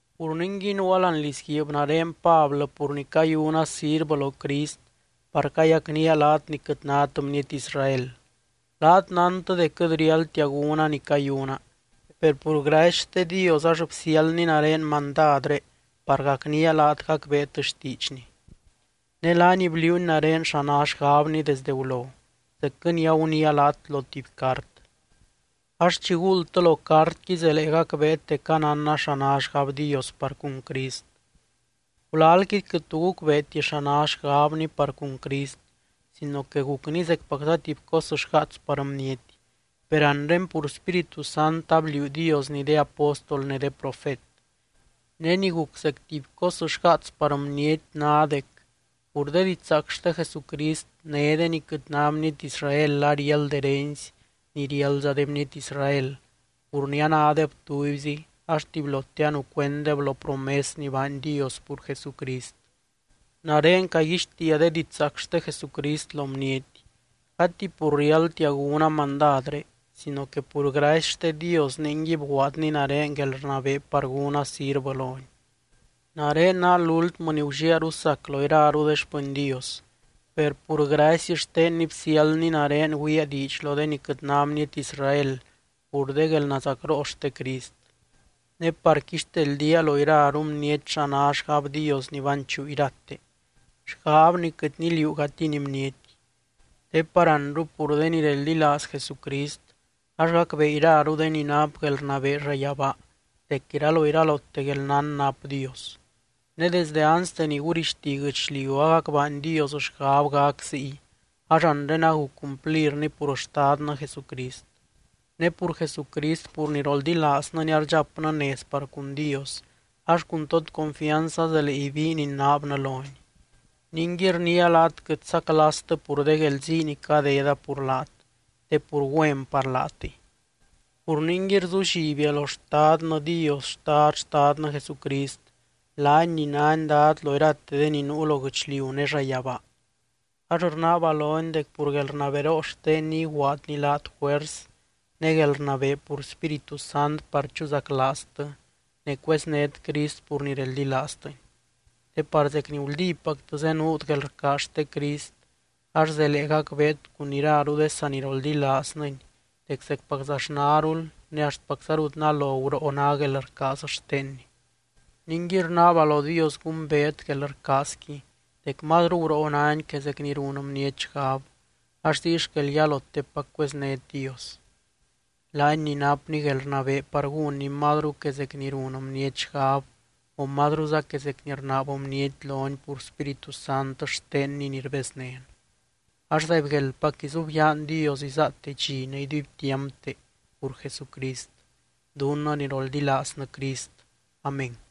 Pur ningui nuua láani lizguiib nare Pablɨ pur ni cayuna sirvɨ lo Crist par cayacnía laat ni quɨt nát bniety Israel. Laat nántɨ dec quɨt riáldtia gúna ni cayuna, per pur gracy xte Dios ax bsiáldny nare mandadré par gacnía laat gacbeet xtiidxny. Ne laany bliuuny nare xa ná xgabny desdɨ gulo, zecquɨ ni aguniia laat lo tuby cart. Ax chi guuldtɨ lo cartqui zelee gacbeet dec anánna xa ná xgab Dios par cun Crist. Gulalqui quɨt tu gucbeeti xa ná xgabny par cun Crist sino que gucny zecpacza tuby cos xgaats par bniety. Per anre pur Spíritu Sant abliuu Diosni de apóstol ne de profet. Ne ni guc zec tuby cos xgaats par bniety ná dec, pur de didxzaac xte Jesucrist, né de ni quɨt ná bniety Israel ariáld herency ni riáldza de bniety Israel pur ni anádeb tubyzi ax tubylote anucuenddeb lo promes ni baany Dios pur Jesucrist. Nare caguixtiia de didxzaac xte Jesucrist lo bniety, gati pur riáldtia gúna mandadré sino que pur gracy xte Dios ningui bguaadny nare guelrnabee par gúna sirvɨ lony. Nare ná lúltmɨ ni gulliaru sac lo iraru de xpɨny Dios, per pur gracy xtenny bsiáldny nare güiaa diidx lo de ni quɨt ná bniety Israel pur de guelnazacroo xte Crist. Ne par quixteldía lo iraru bniety xa ná xgab Dios ni banchuu irate, xgab ni quɨt niliuugatiny bniety. Te par anru pur de ni reldilaaz Jesucrist ax gacbee iraru de ni nap guelrnabee llayabaa dec iraloiralote guelnán nap Dios. Ne desdɨ anste ni gurixti guɨchliu agac baany Dios xgab gac ziy ax anre aguc cumplirni pur Xtadnɨ Jesucrist. Ne pur Jesucrist pur ni roldilaaznɨny ardxapnɨ nez par cun Dios ax cun tod confianz azelee ibiin inaabnɨ lony. Ningui, rniia laat quɨt saclastɨ pur de guelzii ni cadeda pur laat, te pur güen par laatɨy. Pur ningui, rzullibia lo Xtadnɨ Dios Xtad Xtadnɨ Jesucrist, laany ni nány Dad lo irate de ni nuu lo guɨchliu ne llayabaa. Ax rnaaba lony dec pur guelrnaberoo xtenny iguaadny laat juers ne guelrnabee pur Spíritu Sant par chuzaclaaztɨ ne cueznét Crist pur ni reldilaaztɨny. Te par zec ni guldípactɨ zenuut guelrcaaz xte Crist, ax zelee gacbeet cun iraru de saniroldilaaznɨny dec zecpaczaxnarul ne axtpacza rut nalo guroo ná guelrcaaz xtenny. Ningui rnaaba lo Dios gumbeet guelrcaazqui dec mazru guroo náni que zec ni run bniety xgab ax ziy xquel yalotepac cueznét Dios. Laany ni napny guelrnabee par gúnny mazru que zec ni run bniety xgab o mazruza que zec ni rnaab bniety lony pur Spíritu Sant xtenny ni rbeznén, ax zaibgueldpac izubyaan Dios izaate dxi ne iduibtiampte pur Jesucrist, dunnɨ ni roldilaaznɨ Crist. Amén.